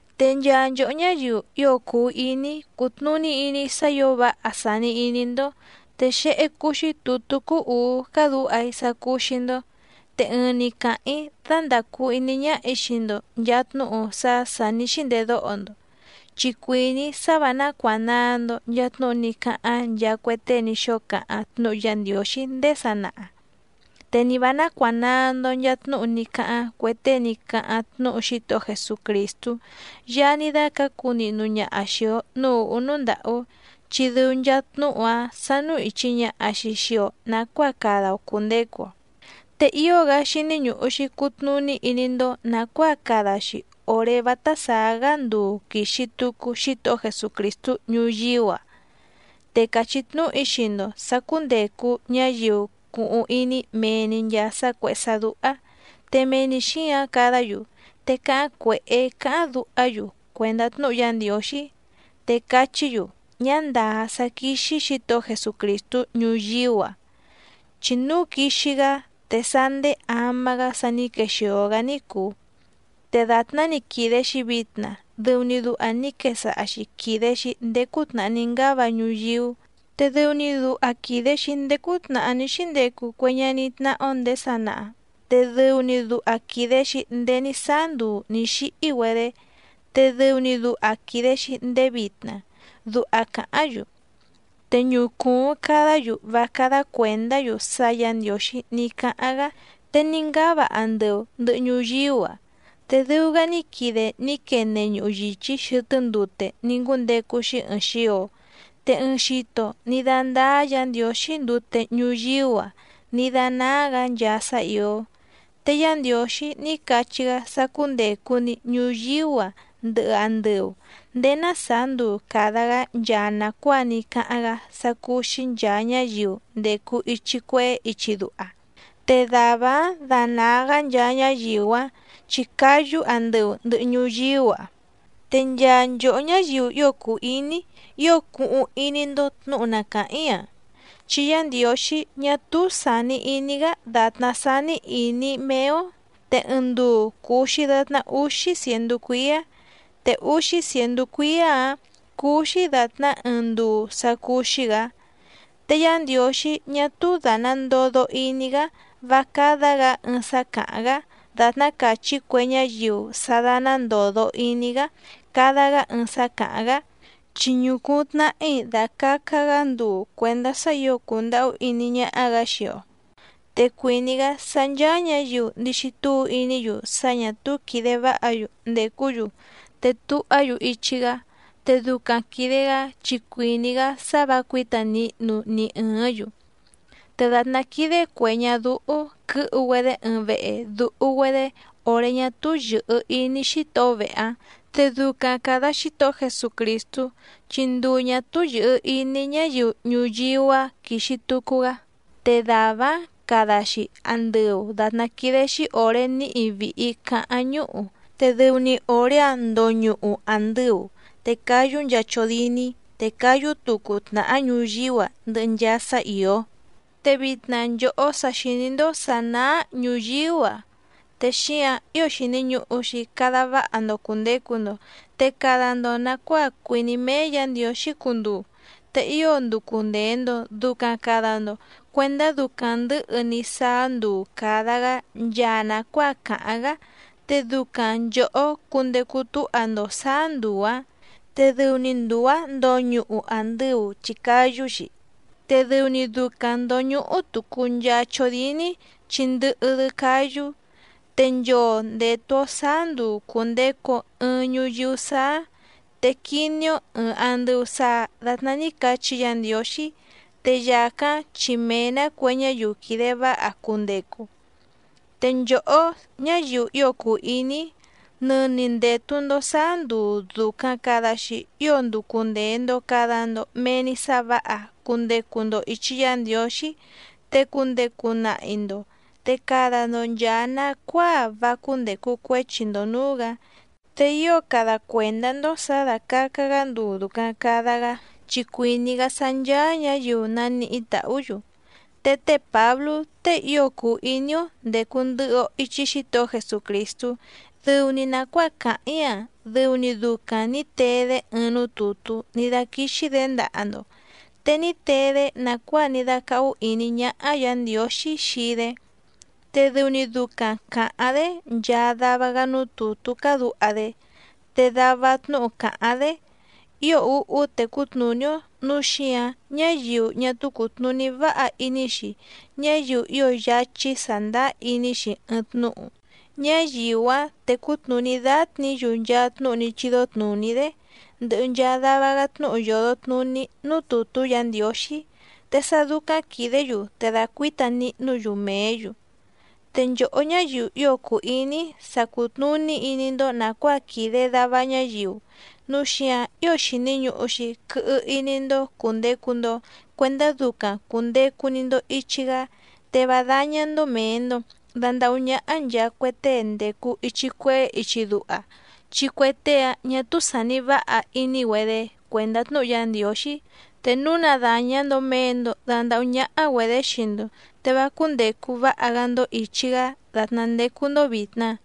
Te nchaa nchòhó ñáyiu ío cùu iní‑í cùtnuní iní‑í sá ǐo váha sàni iní‑ndó, te xéhé cúú‑xí tùtú cúú ùú cádǔha‑í sá cúú‑xí‑ndó, te ɨɨⁿ‑ni càháⁿ‑í dándàcu iní ñáhà‑í xii‑ndo nchàa tnúhu sá sà ní xíndedóho‑ndo. Chi cuìní‑í sá vǎ nácuànaa‑ndo nchaa tnúhu ní cáháⁿ nchaa cue tée ní xóo cáháⁿ tnúhu Yá Ndiǒxí ndéé sanaha, te ni vǎ nácuànaa‑ndo nchaa tnúhu ní cáháⁿ cue tée ní cáháⁿ tnúhu Xítohó Jesucrìstú Yaá ní dácǎcu nihnu ñaha xìi‑o núú ùhú núú ndàhú, chi dɨu nchaa tnúhu‑áⁿ sánú ìchi ñaha‑xi xii‑o nacuáa cada‑o cùndecu‑o. Te ío‑gá xíní ñùhu‑xi cutnuní iní‑ndó nàcuáa cada‑xi òré vátá sàá‑gá nduu quìxi tucu Xítohó Jesucrìstú ñuyíú‑a, te càchí tnúhu‑í xii‑ndo sǎ cúndècu ñáyiu cuhuⁿ iní mee‑ni nchàa sá cuèhé sá dúhá te mee‑ni xǐǎⁿ cadá‑yu, te cáháⁿ cuèhé cáháⁿ duhá‑yu cuèndá tnúhu Yá Ndiǒxí. Te cachí‑yu: “Ñá ndàá sá quíxí Xǐtohó Jesucrìstú ñuyíú‑a, chi núu quixi‑gá te sá nděé ama‑gá sa ní quexìo‑gá ní cùu. Te dàtná‑ni quìde‑xi vitna dɨu‑ni duha ní quesaha‑xi quìde‑xi ndéé cútnàhá ní ngáva ñuyíú, te dɨu‑ni duha quìde‑xi ndéé cútnàhá ní xíndecu cue ñaní tnáhá‑ó nděé sanaha, te dɨu‑ni duha quìde‑xi ndéé ní sáá nduu ní xíhí‑güedé, te dɨu‑ni duha quìde‑xi ndéé vitna”, duha cáháⁿ‑yu. Te ñucùuⁿ cadá‑yu vá cádá cuèndá‑yu sá Yǎ Ndiǒxí ní cáháⁿ‑gá te ní ngúndecu andɨu ndɨ̀hɨ ñuyíú‑a, te dɨu‑gá ní quide ní quene ñuhu yìchí xɨtɨ́ ndute ní ngúndecu‑xi ɨɨⁿ xio. Te ɨɨⁿ xito ní dándáá Yǎ Ndiǒxí ndute ñuyíú‑a ní dánáá‑gǎ nchaa sá ìó. Te Yá Ndiǒxí ní cachí‑gá sá cúndècu‑ni ñuyíú‑a ndɨhɨ andɨu nděé ná sàá nduu càda‑gá nchaa nàcuáa ní cáháⁿ‑gá sá cúú‑xí nchàa ñáyiu ndècu ichi cuehé ichi duha, te dàvá‑áⁿ danàa‑gá nchaa ñáyiu‑áⁿ chi cáyú andɨu ndɨhɨ ñuyíú‑a. Te nchaa nchòhó ñáyiu ío cùu iní‑í, ío cuhuⁿ iní‑ndó tnǔhu na càháⁿ‑í‑a, chi Yá Ndiǒxí ñá túú sàni iní‑gá dàtná sání ìní méé‑ó, te ɨɨⁿ nduu cùu‑xi datná úxí cièndú cuíá, te úxí cièndú cuíá‑ǎⁿ cúú‑xí dàtná ɨɨⁿ nduu sá cúú‑xí‑gǎ. Te Yá Ndiǒxí ñá túú dàna ndodo iní‑gá vá cádá‑gǎ ɨɨⁿ sá càháⁿ‑gá dàtná càchí cue ñáyiu sá dáná ndòdo iní‑gá cada‑gá ɨɨⁿ sá càháⁿ‑gá, chi ñucùuⁿ tnahí dàcaca‑gá nduu cuèndá sá ǐo cùndahú iní ñáhá‑gǎ xii‑o, te cuìní‑gá sá ncháá ñǎyiu ndixi túu iní‑yu sá ñà túú quìde váha‑yu ndècú‑yu te tuhá‑yu ichi‑gá, te ducaⁿ quìde‑gá chi cuìní‑gá sá vǎ cuǐta nihnu ni ɨ̀ɨ́ⁿ‑yu. Te dàtná quídé cuè ñadúhú quɨ̌hu‑güedé ɨɨⁿ vehe dùhu‑güedé òré ñá túú yɨ̀hɨ iní xítohó vehe‑áⁿ, te ducaⁿ càda Xítohó Jesucrìstú chi nduu ñà túú yɨ̀hɨ iní ñáyiu ñuyíú‑a quixi tucu‑gá, te dàvá‑áⁿ cada‑xi andɨu dàtná quídé‑xí òré níhi vìhi caháⁿ ñúhu, te dɨu‑ni òré‑áⁿ ndoñuhu àndɨu, te cáyú nchaa chódíní, te cáyú tucu tnàhá ñuyíú‑a ndɨhɨ nchaa sá ìó. Te vitna nchòhó sa xìní‑ndó sǎ náá ñùyíú‑a te xíǎⁿ ío xìni ñuhu‑xi cada váha‑ndo cùndecu‑ndo, te cada‑ndo nàcuáa cuìní méé Yǎ Ndiǒxí cunduu. Te ío nducu ndèe‑ndo ducaⁿ cada‑ndo cuendá ducaⁿ ndɨ̌hɨ‑ni sáá nduu càda‑gá nchaa nàcuáa càháⁿ‑gá, te ducaⁿ nchòhó cundecu túha‑ndo sǎá nduu‑ǎⁿ. Te dɨu‑ni nduu‑ǎⁿ ndoñuhu àndɨu chi cáyú‑xi, te dɨu‑ni ducaⁿ ndòñuhu tucu nchaa chódíní chi ndɨhɨ‑dɨ cáyú. Te nchoo ndètu‑o sáá nduu cùndecu‑o ɨɨⁿ ñuyíú sáá, te quiní‑ó ɨ̀ɨⁿ andɨu saa datná ní cachí Yǎ Ndiǒxí, te yàcáⁿ chi mee‑nǎ cue ñáyiu quìde váha cundecu. Te nchòhó ñáyiu ío cùu iní‑í, nɨni ndètu‑ndo sáá nduu dùcaⁿ cada‑xi ío nducu ndèe‑ndo cada‑ndo mee‑ni sá vǎha cundecu‑ndo ìchi Yá Ndiǒxí, te cundecu nahi‑ndo, te cada‑ndo nchàa nacuáa vá cúndècu cuéchi‑ndo nǔú‑gǎ. Te ío cada cuèndá‑ndó sǎ dàcaca‑gá nduu dùcaⁿ cada‑gá chi cuìní‑gá sá ncháá ñǎyiu naníhí tàhú‑yu. Te té Pǎblú tée ío cùu iní‑ó ndècu ndɨhɨ‑o ichi Xítohó Jesucrìstú dɨu‑ni nàcuáa càháⁿ‑í‑a dɨu‑ni ducaⁿ nǐ tee‑dé ɨɨⁿ núú tùtú ní dáquíxí‑dě ndaha‑ndo, te ní tee‑dé nàcuáa ní dácáhú ìní ñáhá Yǎ Ndiǒxí xii‑dé. Te dɨu‑ni ducaⁿ càháⁿ‑dé nchaa dava‑gá núú tùtú cádǔha‑dé, te dava tnúhu càháⁿ‑dé ío úhú tecú tnùní‑ó, núu xíǎⁿ ñáyiu ñá túú cùtnuní váha iní‑xi, ñáyiu ío yáchí sàndáá iní‑xi ɨɨⁿ tnúhu, ñáyiu‑áⁿ tècú tnùní dátnǐ‑yu nchaa tnúhu ní chídó tnùní‑dé, ndɨhɨ nchaa dava‑gá tnúhu yòdo tnuní núú tùtú Yǎ Ndiǒxí, te sá dúcáⁿ quìdé‑yu te dacuǐta nihnú‑yu mèé‑yu. Te nchòhó ñáyiu ío cùu iní‑í, sa cùtnuní iní‑ndó nàcuáa quìde dava ñáyiu, núu xíǎⁿ ío xìni ñuhu‑xi quɨhɨ iní‑ndó cùndecu‑ndo cuendá ducaⁿ cùndecu‑ni‑ndo ichi‑gá, te vá dáñá‑ndó mèe‑ndo dandahú ñáhá nchàa cue tée ndècu ichi cuehé ichi duha, chi cue tée‑áⁿ ñà túú sàni váha iní‑güedé cuèndá tnúhu Yá Ndiǒxí. Te núu na dàña‑ndo mee‑ndo dandahú ñáhá‑güedě xii‑ndo te vá cúndècu váha‑gá‑ndó ìchi‑gá dàtná ndécú‑ndó vìtna.